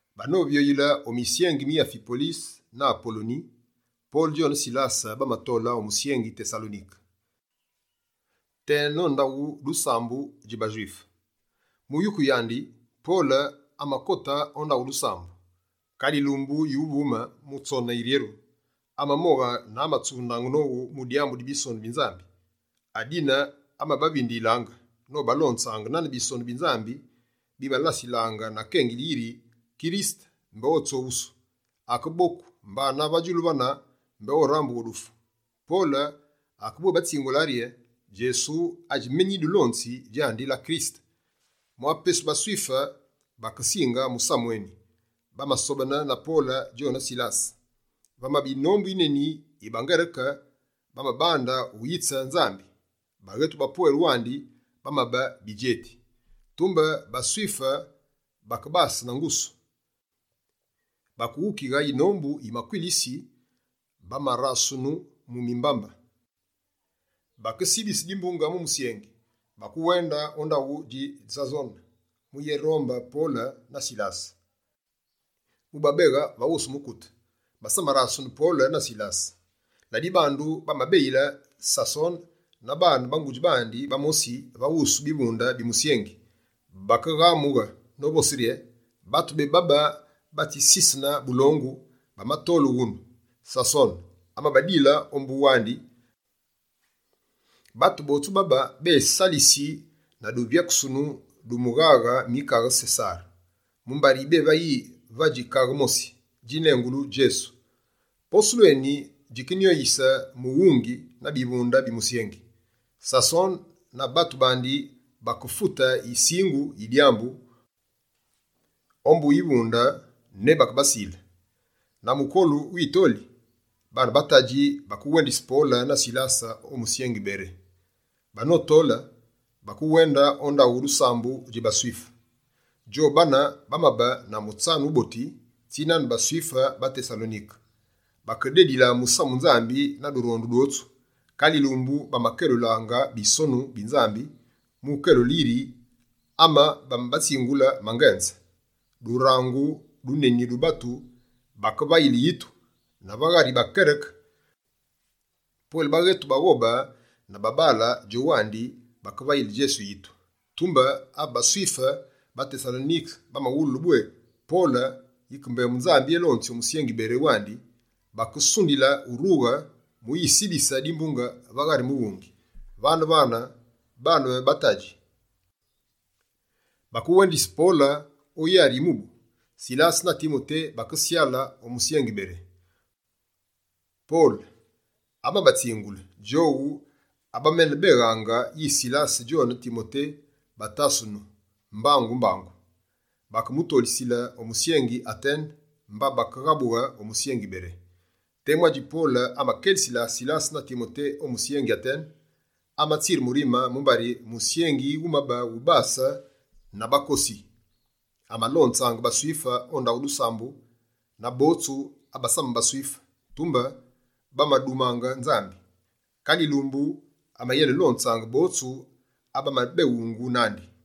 Banovyoyile o misyengi mi Afipolise na Apoloni, Pole djone Silase bamatole o musyengi Tesalonike, tena ndaghu dusambu dji baSwife. Mu yuku yandi, Pole amakote o ndaghu dusambu. Kale yilumbu yuvumine, mu tsone yiryeru, amamoghe na amatsunde nowu mu dyambu di Bisonu bi Nzambi. Adine amabavindiyilaange nobalonzaange nane Bisonu bi Nzambi, bimalasilaange na kengili yiri, Kirisete mbé otsoghusu, akeboku, mbana va djulu vane, mbé orambughe o dufu. Pole akebwébatsingule rye: «Djesu adji menu nyidulonzi, djandi la Kirisete.» Mwa pesu baSwife bakesinge musamu eni, bamasobene na Pole djone Silase. Vamabe yinombu yineni yi baNgereke bamabande uyitse Nzambi, baghetu bapwele wandi bamabe bidjeti. Tumbe baSwife bakebase na ngusu. Bakeghukighe yinombu yi makwilisi bamarasunu mu mimbambe, bakesibisi dimbunge mu musyengi. Bakewende o ndaghu dji Sason mu yenerombe Pole na Silase, mubabeghe va wusu mukute. Basamarasunu Pole na Silase. Ladibandu, bamabeyile Sason na baane ba ngudji bamosi va wusu bivunde bi musyengi. Bakeghamughe, novose rye: «Batu bebabe batsisisene bulongu, bamatole wunu! Sason amabadile ombu wandi! Batu botsu babe bésalisi na duvyakusunu du mighaghe mi kaghe Sesare, mumbari bévayi yi vadji kaghe mosi, djinengulu Djesu.» Posulu eni, djikenyoyise mughungi na bivunde bi musyengi. Sason na batu bandi bakefute yisingu yi dyambu ombu bivunde ne bakebasile. Na mukolu witoli, baane ba tadji bakewendise Pole na Silase o musyengi Bere. Banotole, bakewende o ndaghu dusambu dji baSwife. Djobane bamabe na mutsanu wuboti tsinane baSwife ba Tesalonike. Bakedile Musamu Nzambi na durondu dwotsu. Kale yilumbu, bamakelulange Bisonu bi Nzambi mu ukelule yiri ame bamabatsingulaange mangenze. Durangu duneni du batu bakevayile yitu, na va ghari baNgereke: pwele baghetu baghobe na babaale djowandi bakevayile Djesu yitu. Tumbe ave baSwife ba Tesalonike bamawulu bwé Pole yike mbembu Nzambi elonzi o musyengi Bere wandi, bakesundili urughe mu yisibise dimbunge va ghari mughungi. Vane-vane, baane ba tadji bakewendise Pole o yari yi mubu. Silase na Timote bakesyale o musyengi Bere. Pole, amabatsingule djowu abaménebeghaange yi Silase djone Timote batasunu mbangu-mbangu. Bakemutolise o musyengi Atene, mba bakeghabughe o musyengi Bere. Temu adji Pole amakelisile Silase na Timote o musyengi Atene, amatsire murime mumbari musyengi wumabe wubase na bakosi. Amalonzaange baSwife o ndaghu dusambu na botsu abasamabe baSwife, tumbe bamadumaange Nzambi. Kale yilumbu, amayenelonzaange botsu abamenebengunu nandi.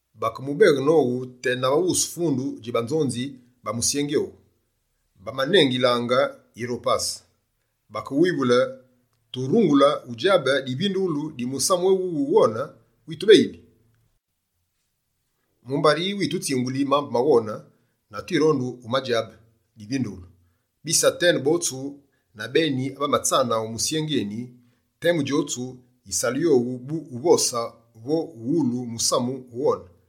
Bakemubeghe nowu, tena va wusu fundu dji banzonzi ba musyengi owu, bamanengilaange «Yiropase». Bakemuwivule: «Turungule udjabe divindughulu di musamu éwuwu wughone witubeyili? Mumbari yitutsinguli mambu maghone, na twirondi udjabe divindughulu.» Bise Atene botsu na beni abamatsana o musyengi eni, temu djotsu yisalu yowu bu uvose vo uwulu musamu wughone.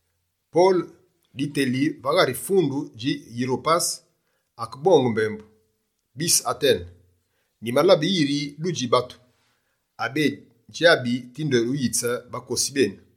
Pole, diteli va ghari fundu dji Yiropase, akebonge mbembu: «Bise Atene, nyimalabe yiri dudji batu, abe bédjabi tinde wuyitse bakosi benu.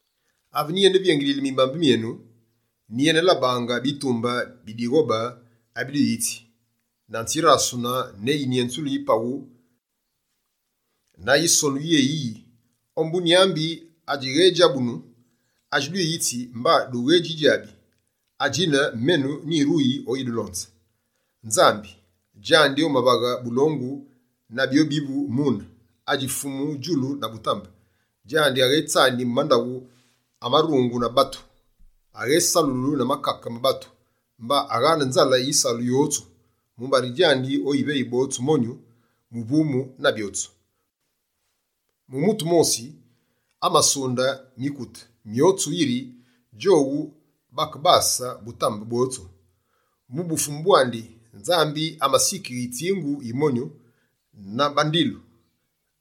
Ave nyiyene vyengililaange mu mimbambe myenu, nyiyenelabaange bitumbe bi dighobe abidwiyitsi, na nzirasunu ne yinyenzulu yi paghu na yisonu yéyiyi: “Ombu nyambi adjighédjabunu.” Adji dwiyitsi mba dughedjidjabi, adjine menu nyiruyi oyidulonze. Nzambi, djandi omavaghe bulongu na byobivu mune, adji Fumu djulu na butambe, djandi aghetsani mu mandaghu amarungu na batu. Aghésalulu na makake ma batu, mba aghane nzale yisalu wotsu. Mumbari djandi oyiveyi botsu monyu, muvumu na byotsu. Mu mutu wumosi, amasunde mikute myotsu yiri djowu bakebase butambe bwotsu. Mu bufumu bwandi, Nzambi amasikighe yitsingu yi monyu, na bandilu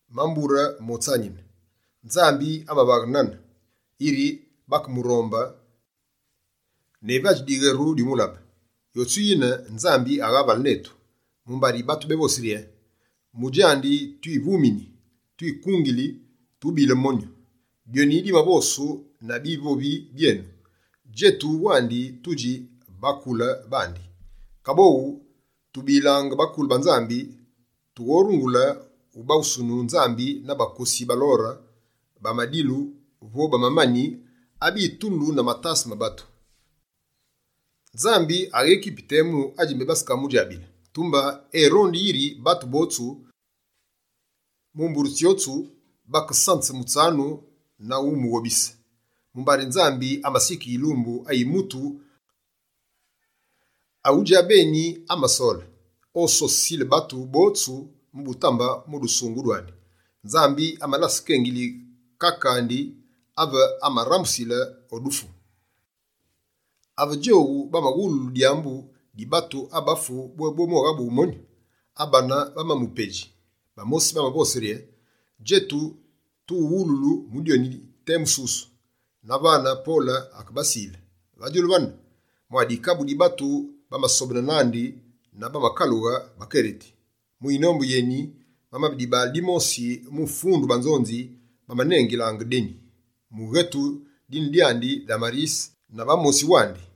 ma mbure motsanine. Nzambi amavaghe nane, yiri bakemurombe ne vadji diweru dyumulabe. Yotsu yine, Nzambi aghavale netu, mumbari batu bévosi rye: “Mu djandi twivumini, twikungili, tubile monyu.” Dyoni dimavosu na bivovi byenu: “Djetu wandi tudji bakule bandi.” Kaboghu tubilange bakule ba Nzambi, toghorungule ubaghusunu Nzambi na bakosi ba lore, ba madilu vo ba mamani, abitulu na matase ma batu. Nzambi aghékipi temu adji mbé bakamudjabile, tumbe erondi yiri batu botsu, mu mbure tsyotsu, bakesanze mutsanu na umughobise. Mumbari Nzambi, amasikighe yilumbu ayi mutu awu djabeni amasole, ososisile batu botsu mu butambe mu dusungughu dwandi. Nzambi amalase kengili kake andi, ave amamurambusile o dufu.» Ave djowu bamawululu dyambu di batu abafu bwé boghabughe monyu, abane bamamupedji. Bamosi bamavose rye: «Djetu tuwuwululu mu dyoni temu susu.» Na vane, Pole akebasile. Va djulu vane, mwa dikabu di batu bamasobene nandi na bamakalughe bakereti. Mu yinombu yeni, vamabe dibaale dimosi mu fundu banzonzi bamanengilaange Deni, mughetu dine dyandi Damarise, na bamosi wandi.